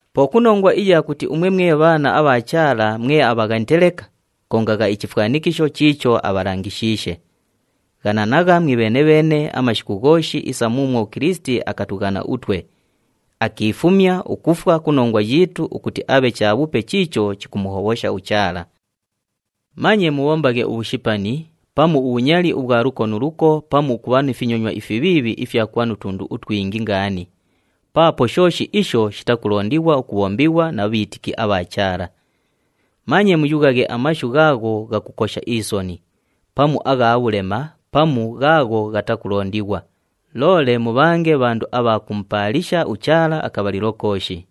Po ku nongwa iya kuti umwe mwe bhaana abha Chaala mwe abhaghanite leka, kongagha ichifwanikisho chiicho abhalangishiishe. Ghananagha mwibheene-bheene amashiku ghooshi isa muumwo uKilisiti akatughana utwe, akiifumya ukufwa ku nongwa yiitu ukuti abhe chabhupe chiicho chikumuhobhosha uChaala. Manye mubhombaghe ubhushipani, pamu ubhunyali ubhwa luko nu luko pamu ukubha ni finyonywa ifibhiibhi ifya kubha nu tundu utwingi ngaani paapo shooshi isho shitakulondighwa ukubhombighwa na bhiitiki abha Chaala. Manye muyughaghe amashu ghaagho ghakukosha isoni, pamu agha bhulema pamu ghaagho ghatakulondighwa, loole mubhange bhandu abha kumupaalisha uChaala akabhalilo kooshi.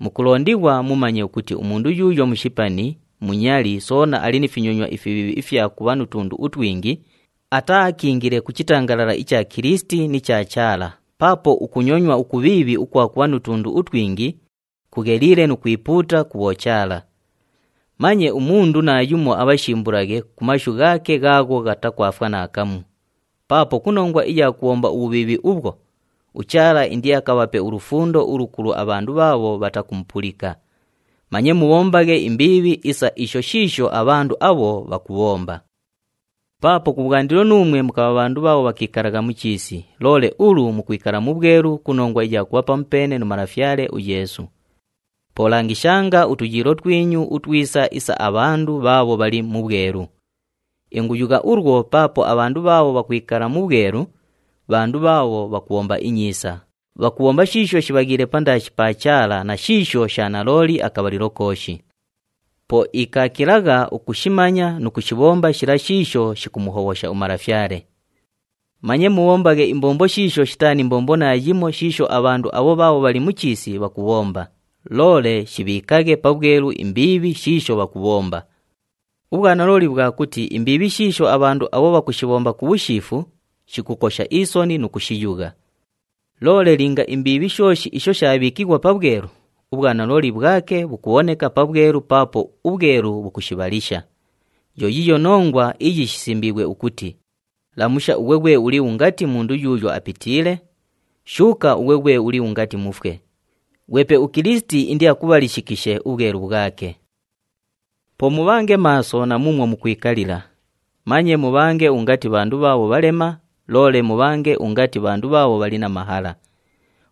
Mukulondighwa mumanye ukuti umundu yuuyo mushipani, munyali soona ali ni finyonywa ifibhiibhi ifya kubha nu tundu utwingi, ataaakiingile ku chitangalala icha Kilisiti ni cha Chaala paapo ukunyonywa ukubhiibhi ukwa kubha nu tundu utwingi, kugheliile nu kwipuuta ku bhochaala. Manye umundu naayumo abhashimbulaghe ku mashu ghaake ghaagho ghatakwafwa naakamu, paapo ku nongwa iya kubhomba ubhubhiibhi ubhwo, uChaala indiakabhape ulufundo ulukulu abhandu bhaabho bhatakumupulika. Manye mubhombaghe imbiibhi isa isho shiisho abhandu abho bhakubhomba. Paapo kubhwandilo nuumwe mukabha bhandu bhaabho bhakiikalagha mu chiisi, loole ulu mukwikala mu bhwelu ku nongwa iya kubha pamupeene nu Malafyale uYeesu. Po langishanga utuyiilo twinyu utwisa isa abhandu bhaabho bhali mu bhwelu. Inguyugha ulwo paapo abhandu bhaabho bhakwikala mu bhwelu, bhandu bhaabho bhakubhomba inyiisa, bhakubhomba shiisho shibhaghiile pandaashi pa Chaala na shiisho sha nalooli akabhalilo kooshi. Po ikaakilagha ukushimanya nu kushibhomba shila shiisho shikumuhobhosha uMalafyale. Manye mubhombaghe imbombo shiisho shitaa ni mbombo naayimo shiisho abhandu abho bhaabho bhali mu chiisi bhakubhomba, loole shibhiikaghe pabhwelu imbiibhi shiisho bhakubhomba. Ubhwanalooli bhwa kuti imbiibhi shiisho abhandu abho bhakushibhomba ku bhushiifu, shikukosha isoni nu kushiyugha. Loole linga imbiibhi shooshi isho shaabhiikighwa pabhwelu, ubhwanalooli bhwake bhukubhoneka pabhwelu paapo ubhwelu bhukushibhalisha. Yo yiiyo nongwa iyi shisimbiighwe ukuti, “Lamusha ughwe ghwe uli ungati mundu yuuyo apitiile, shuuka ughwe ghwe uli ungati mufwe, ghwepe uKilisiti indiakubhalishikishe ubhwelu bhwake.” Po mubhange maaso na muumwo mukwikalila, manye mubhange ungati bhandu bhaabho bhalema, loole mubhange ungati bhandu bhaabho bhali na mahala.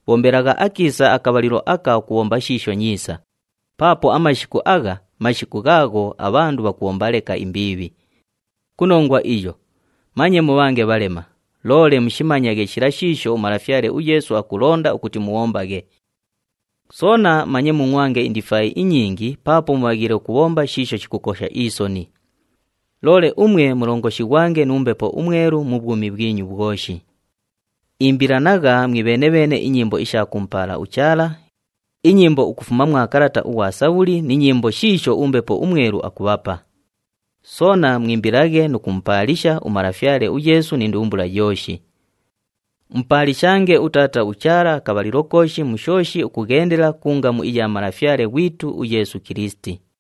Bhombelagha akiisa akabhalilo aka ukubhomba shiisho nyiisa, paapo amashiku agha, mashiku ghaagho abhandu bhakubhomba leka imbiibhi. Ku nongwa iyo, manye mubhange bhalema, loole mushimanyaghe shila shiisho uMalafyale uYeesu akulonda ukuti mubhombaghe. Soona manye mungʼwange indifaayi inyingi paapo mubhaghiile ukubhomba shiisho shikukosha isoni. Loole umwe mulongoshighwange nu Mbepo uMwelu mu bhwumi bhwinyu bhwoshi. Imbilanagha mwibheene-bheene inyimbo isha kumupaala uChaala, inyimbo ukufuma mwa kalata ughwa Sabhuli ni nyimbo shiisho uMbepo uMwelu akubhapa. Soona mwimbilaghe nu kumupaalisha uMalafyale uYeesu ni ndumbula yooshi. Mupaalishange uTaata uChaala akabhalilo kooshi mu shooshi ukughendela ku ngamu iya Malafyale ghwitu uYeesu Kilisiti.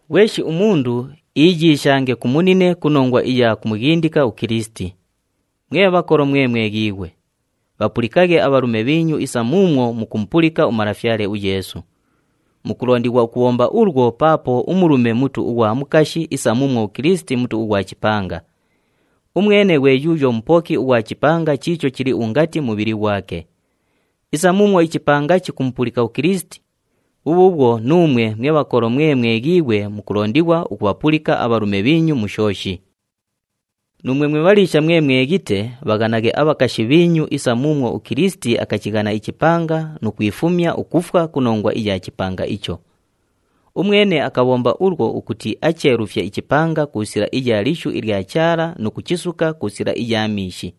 Ghweshi umundu iiyiishange ku munine ku nongwa iya kumughindika uKilisiti. Mwe bhakolo mwe mweghiighwe! Bhapulikaghe abhalume bhiinyu isa muumwo mukumupulika uMalafyale uYeesu. Mukulondighwa ukubhomba ulwo paapo umulume mutu ughwa mukashi isa muumwo uKilisiti Mutu ughwa chipanga. Umwene ghwe yuuyo Mupoki ughwa chipanga chiicho chili ungati mubhili ghwake. Isa muumwo ichipanga chikumupulika uKilisiti, bhubhuubhwo nuumwe mwe bhakolo mwe mweghiighwe mukulondighwa ukubhapulika abhalume bhiinyu mu shooshi. Nuumwe mwe bhaliisha mwe mweghite, bhaghanaghe abhakashi bhiinyu isa muumwo uKilisiti akachighana ichipanga nu kwifumya ukufwa ku nongwa iya chipanga icho. Umwene akabhomba ulwo ukuti acheelufye ichipanga ku sila iya lishu ilya Chaala nu kuchisuka ku sila iya miishi.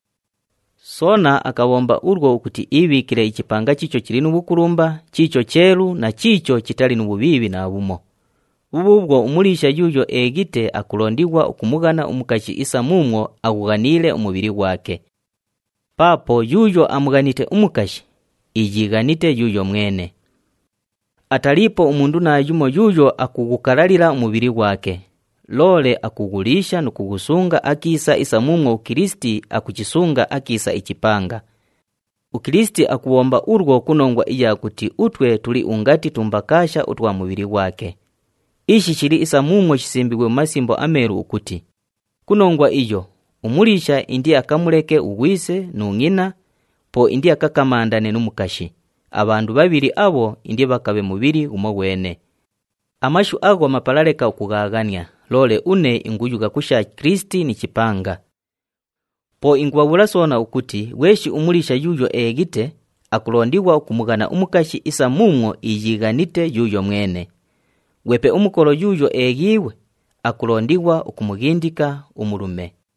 Soona akabhomba ulwo ukuti iibhiikile ichipanga chiicho chili nu bhukulumba, chiicho cheelu na chiicho chitali nu bhubhiibhi naabhumo. Bhubhuubhwo umuliisha yuuyo eeghite akulondighwa ukumughana umukashi isa muumwo aghughaniile umubhili ghwake. Paapo yuuyo amughanite umukashi, iiyiighanite yuuyo mwene. Ataliipo umundu naayumo yuuyo akughukalalila umubhili ghwake, loole akughuliisha nu kughusunga akiisa isa muumwo uKilisiti akuchisunga akiisa ichipanga. UKilisiti akubhomba ulwo ku nongwa iya kuti utwe tuli ungati tumbakaasha utwa mubhili ghwake. Ishi shili isa muumwo shisimbiighwe mu Masimbo aMeelu ukuti, “Ku nongwa iyo, umuliisha indiakamuleke ughwise nu ngʼina, po indiakakamandane nu mukashi, abhandu bhabhili abho indibhakabhe mubhili ghumoghwene.” Amashu agho mapala leka ukughaaghania, loole une inguyugha ku sha Kilisiti ni chipanga. Po ingubhabhuula soona ukuti ghweshi umuliisha yuuyo eeghite, akulondighwa ukumughana umukashi isa muumwo iiyiighanite yuuyo mwene. Ghwepe umukolo yuuyo eeghiighwe, akulondighwa ukumughindika umulume.